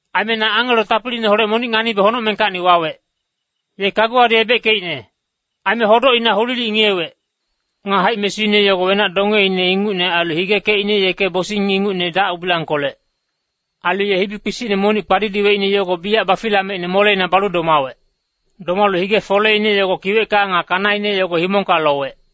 Aime na angelo tapiliineholec monic nganibe honocmengkacni wawec. Ye kaguwadi ebeckeicne. Aime hodocina hulilic ngiyewec. Nga haic-mesuine yogo wenac-dongeine ingucne ailu higekecine yeke bosing ingucne dac-ubilangkolec. Ailu ye hibi kpisicne monic kpadidiweicne yogo biyac bafilameicne moleina balu domawec. Domalu hige foleine yogo kiwecka nga kanaine yogo himongka lowec.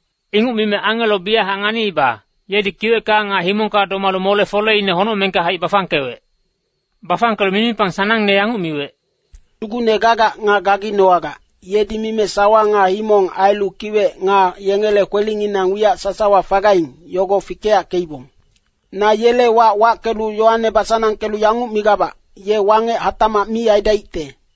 Inguc mime angelo biyachac nganiiba, yedi kiwecka nga himongka domalu mole-foleine honocmengka haic bafangkewec. Bafangkelu mimipang sanangne yanguc miwec, “Sugucne gagac nga gaginowagac, yedi mime sawa nga himong ailu kiwec nga yengele kwelinginang wiyac sasawa fagaing, yogo fikeyackeibong. Na yele wac wackelu yowane basanangkelu yanguc migabac, ‘Ye wangec hatacmac mi aidaicte.’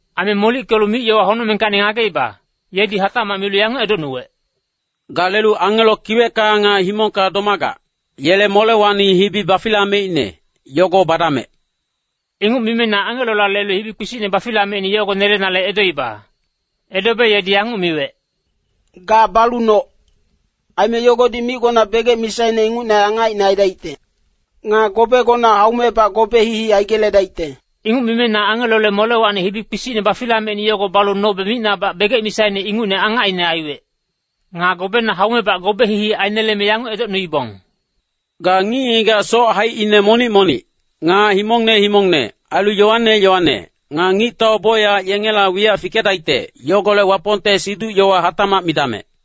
Aime molickelu mic-yowa honocmengkacni ngageiba, yedi hatacmac milu yanguc edocnuwec, “Ga lelu angelo kiwecka nga himongka domagac, yele molewacni hibi bafilameicne, yogo badamec.” Inguc mime na angelola lelu hibi kpisicne bafilameicne yogo nelenale edoiba. Edobe yedi yanguc miwec, “Ga balu noc. Aime yogodi micgona begec misaine ingucne angacine aidaicte. Nga gobegona haumebac gobe hihi aigeledaicte.” Inguc mime na angelole molewacni hibi kpisicne bafilameicne yogo balu nobe micnabac begec misaine ingucne angacine aiwec. Nga gobena haumebac gobe hihi aineleme yanguc edocnuibong, “Ga ngic-ngigac soc haicine monic-monic, nga himongne himongne, ailu yowane yowane, nga ngictau bocyac yengela wiyac fikedaicte, yogolec Wapongte siduc-yowa hatacmac midamec.”